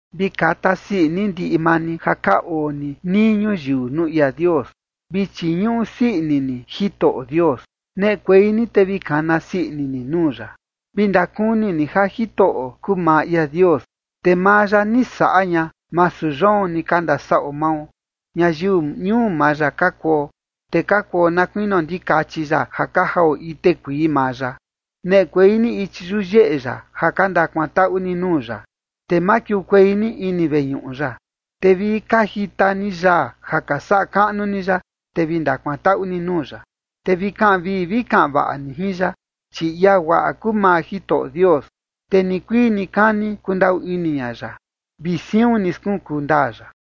Vi kata sii ini ndiꞌi maa ni ja ka oo ni nii ñuyiu nuu ia Dios. Vi chiñuꞌu sii ini ni Jitoꞌo Dios. Neꞌekuei ni te vi kana sii ini ni nuu ya. Vi ndakuni ni ja Jitoꞌo kuu maa ia Dios. Te maa ya ni saꞌa ña, masu yoon ni ka ndasaꞌo mao. Ñayiu ñuu maa ya ka kuo, te ka kuo na kuinio ndikachi ya ja ka jao ite kuii maa ya. Neꞌekuei ni ichi yuyeꞌe ya ja ka ndakuantaꞌu ni nuu ya. Te makiukuei ni ini veñuꞌu ya, te vi ka jita ni yaa ja ka saꞌa kaꞌnu ni ya. Te vi ndakuantaꞌu ni nuu ya, te vi kaꞌan vii vi kaꞌan vaꞌa ni jin ya. Chi ia guaꞌa kuu maa Jitoꞌo Dios, te nikuii nikani kundaꞌu ini ña ya, vi siun ni skunkuu ndaa ya.